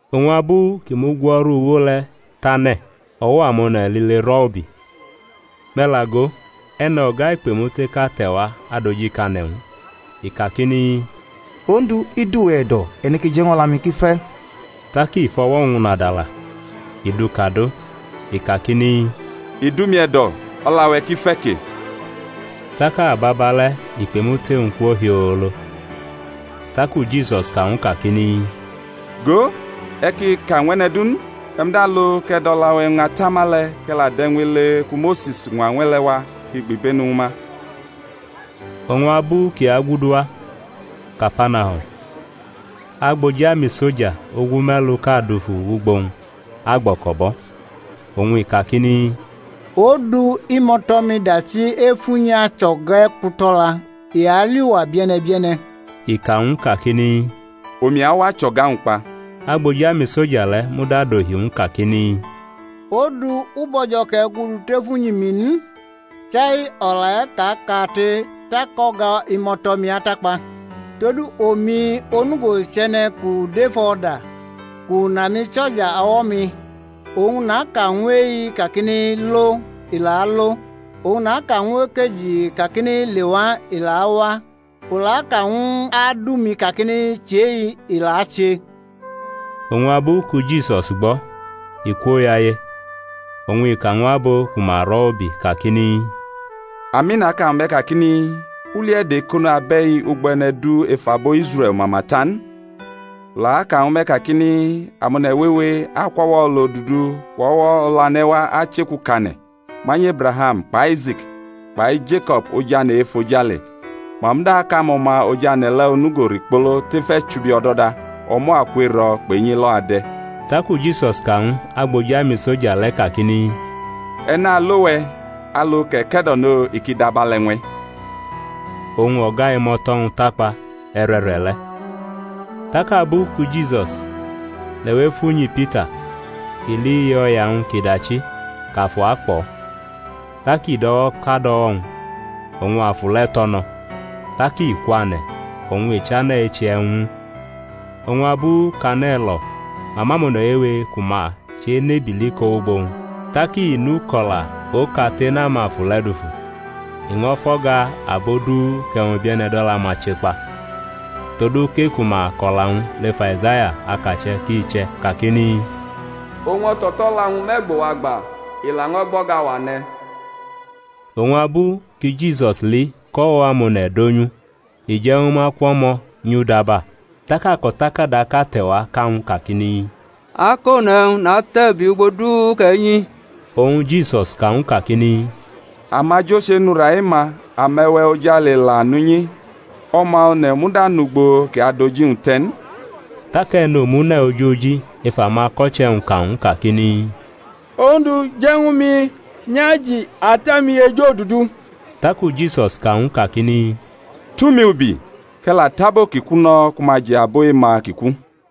Oñ abu kʼi mugwo̩rʼuwo le̩ tane̩, o̩wo̩ amone̩ lile rʼo̩ ubi. Me̩ la go, e̩no̩ga ikpemuteʼka te̩wa adojikane̩ ñw u, i kakini, Ondu, i dʼuwe̩ e̩do̩ e̩ neke je̩ ñw o̩la-mi kʼi fe̩. Tak i fʼo̩wo̩-wñ nadala, i dʼu kadʼo, i kakini, I dʼumi e̩do̩, o̩la-we̩ ki fe̩ ke. Tak ababale̩ ikpemute-wñ kwo hiolo. Taku Jisus ka ñw u kakini, Go, e̩ ki ka ñw e̩ne̩ du n; e̩ muda lo, kʼe̩ dʼo̩la-we̩ ñʼatama kʼe̩ la dʼe̩wñ ele ku Mose̩s ñwa le̩ wa kʼi gbibenu ñwu ma. Oñ abu kʼi agudu wa Kapanahum agboji amisoja ogume̩luʼka dufu wʼugbo-wñ agbo̩ko̩bʼo̩, oñ i kakini, Ondu, imo̩to̩-mi dachi ef unyi acho̩ga e̩kuto̩la, i ali uwa bie̩ne̩ bie̩ne̩. I ka ñw u kakini, Omi awa achʼo̩ga-wñ kpa. Agboji amisoja le̩ muda dohi ñw u kakini, Ondu, u bo̩jo̩ kʼe̩ gudu tef unyi-mi n. Chai o̩la e̩ ka kate, tak o̩ga imo̩to̩-mi atakpa. Todu omi onugo chʼe̩ne̩ kʼu dʼef o̩da, kʼu nʼamisoja o̩wo̩-mi, oñ naka ñw e-i kakini, Lo, i la alo; oñ naka ñw ekeji kakini, lewa, i la awa; u la aka ñw adu-mi kakini, Chʼe-i, i la ache. Oñ abu ki Jisus gbo̩, i kwoyaye, oñ i ka ñw abo ku ma rʼo̩ ubi kakini, Ami, naka ñwu me̩ kakini, U li e̩do̩ e̩ko̩no abe̩i ugbo e̩ne̩ du ef abo Israe̩l mama ta n. U la aka ñwu me̩ kakini, Amone̩ wewe akwʼo̩wo̩ olodudu kpʼo̩we̩ olane̩ wa achʼeku kʼane̩ manyʼEbraham kpʼAise̩k kpai Jeko̩b ojane̩ e-efojale, ma muda akʼamo̩ma ojane̩ le̩ onugo rikpolo tef e̩chubi o̩do̩da: o̩mo̩ aku ero̩ kpʼenyi elo̩ ade̩. Taku Jisus ka ñw agboji amisoja le̩ kakini, E̩ nalo we̩, alu kʼe̩ ke̩do̩no, i ki dʼabe̩le̩ ñw e̩. Oñ o̩ga imo̩to̩-wñ takpa e̩re̩re̩ le̩. Tak abu ki Jisus lewʼef unyi Pita, i li iye o̩ya-wñ kʼi dachi, kʼafu akpʼo̩; tak i dʼo̩wo̩ kad o̩wo̩-wñ oñ afu le̩ tʼo̩ no̩. Tak i kwane̩ oñ i chane̩ eche e̩wñ ñw u. Oñ abu kʼane̩ lo̩ ma mʼamone̩ wewe ku ma chʼebili ko wʼugbo-wñ, tak i nʼuko̩la okate nʼamafu le̩ dufu, i ño̩ fʼo̩ga abo du kʼe̩wñ bie̩ne̩ dʼo̩la-ma che kpa. Todu kʼe-ku ma kʼo̩la-wñ lef Aizaya, akache̩ ki che̩ kakini, Owñ o̩to̩to̩la-wñ mʼe̩gbo-wa gba, i laño̩ gbʼo̩ga-wa ne̩. Oñ abu ki Jisus li kʼo̩wo̩ amone̩ donyʼu, i je̩ ñwu ma kwʼo̩mo̩ nyʼudaba. Tak ako̩takadaʼka te̩wa ka ñw u kakini, Akone̩ e̩wñ, natʼe̩ ubi ugbo du kʼe̩ nyi. Oñ Jisus ka ñw u kakini, Amajo chenʼura e-ma, ame̩we̩ ojale la nʼunyi, O̩ma One̩ muda nʼugbo kʼi adʼoji-wñ te̩ n. Tak e̩nomune̩ ojoji ef amako̩che̩-wñ ka ñw u kakini, Ondu, je̩ ñwu mi nyʼaji ata-mi ejodudu. Taku Jisus ka ñw u kakini, Tumi ubi, kʼe̩ la tʼabo ki ku no̩ ku ma ji abo e-ma ki ku.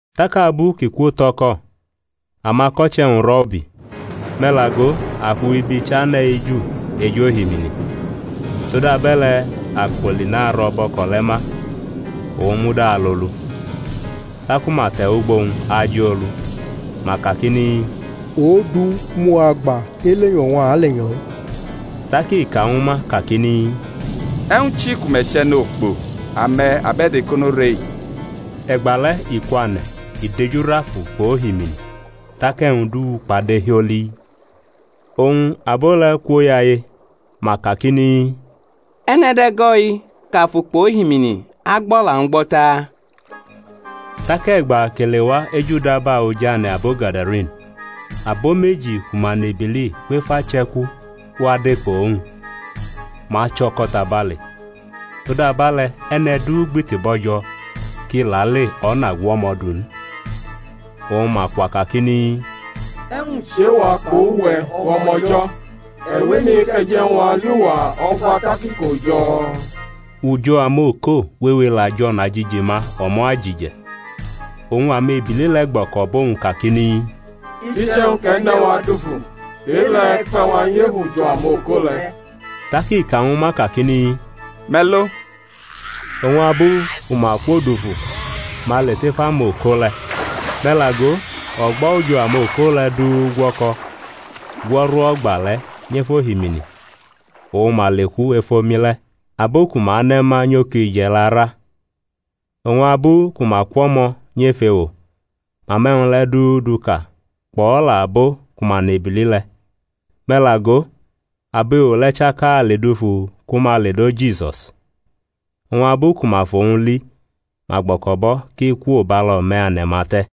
Tak abu kʼi kwotʼo̩ko̩, amako̩che̩-wñ rʼo̩ ubi. Me̩ la go, afu ibi chane̩ eju ej ohimini, todabe̩le̩ akpoli naro̩ bʼo̩ko̩ le̩ ma, owñ muda alolu. Taku ma te̩ wʼugbo-wñ ajʼo olu, ma kakini, Ondu, mʼuwa gba, elenyo̩ oñ a alenyo̩-i. Tak i ka ñwu ma kakini, E̩wñ chi ku me̩ chʼe̩nokpo? ame̩, abe̩do̩ ekono re-i. E̩gbale̩ i kwane̩ i dejurʼafu kpʼohimini, tak e̩wñ du kpade hioli. Oñ abo le̩ kwoyaye, ma kakini, E̩ne̩ dʼe̩go̩-i kʼafu kpʼohimini agbʼo̩la-wñ gbo̩ taa? Tak e̩gba kʼi lewa ejudaba oj ane̩ abo Gadarene, abo meji ku ma nʼebili kwʼef ache̩ku wa de kpʼowñ; ma cho̩ko̩ tabale, todabe̩le̩ e̩ne̩ du gbiti bo̩jo̩ kʼi lale o̩na gu o̩mo̩ du n. Oñ ma kwa kakini, E̩wñ chʼe-wa kpʼuwe̩, O̩ma O̩jo̩? E̩ wʼemi kʼe̩ je̩ ñw a li uwa o̩gba tak iko jo̩? Ujo̩ amoko wewe la jʼo̩najiji ma o̩mo̩ ajije̩. Oñ amebili le̩ gbo̩ko̩bʼowñ kakini, Iche̩wñ kʼe̩ ne wa dufu, e-le̩ e̩ kpe̩ wa nyʼef ujo̩ amoko le̩. Tak i ka ñwu ma kakini, Me̩ lo. Oñ abu ku ma kwo dufu ma le tef amoko le̩. Me̩ la go, o̩gbo̩ ujo̩ amoko le̩ du gwo̩ko̩ gwo̩rʼo̩gba le̩ nyʼef ohimini, oñ ma leku ef omi le̩. Abo ku ma ne̩ ma nyʼokije̩ la ra, oñ abu ku ma kwʼo̩mo̩ nyʼef ewo, ma mʼe̩wñ le̩ du du ka, kpʼo̩la abo ku ma nʼebili le̩. Me̩ la go, abo ewo le̩ chaka le dufu ku ma ledo Jisus: oñ abu ku ma fʼowñ li ma gbo̩ko̩bʼo̩ kʼi kwo bʼalo̩me̩ ane̩-ma te̩.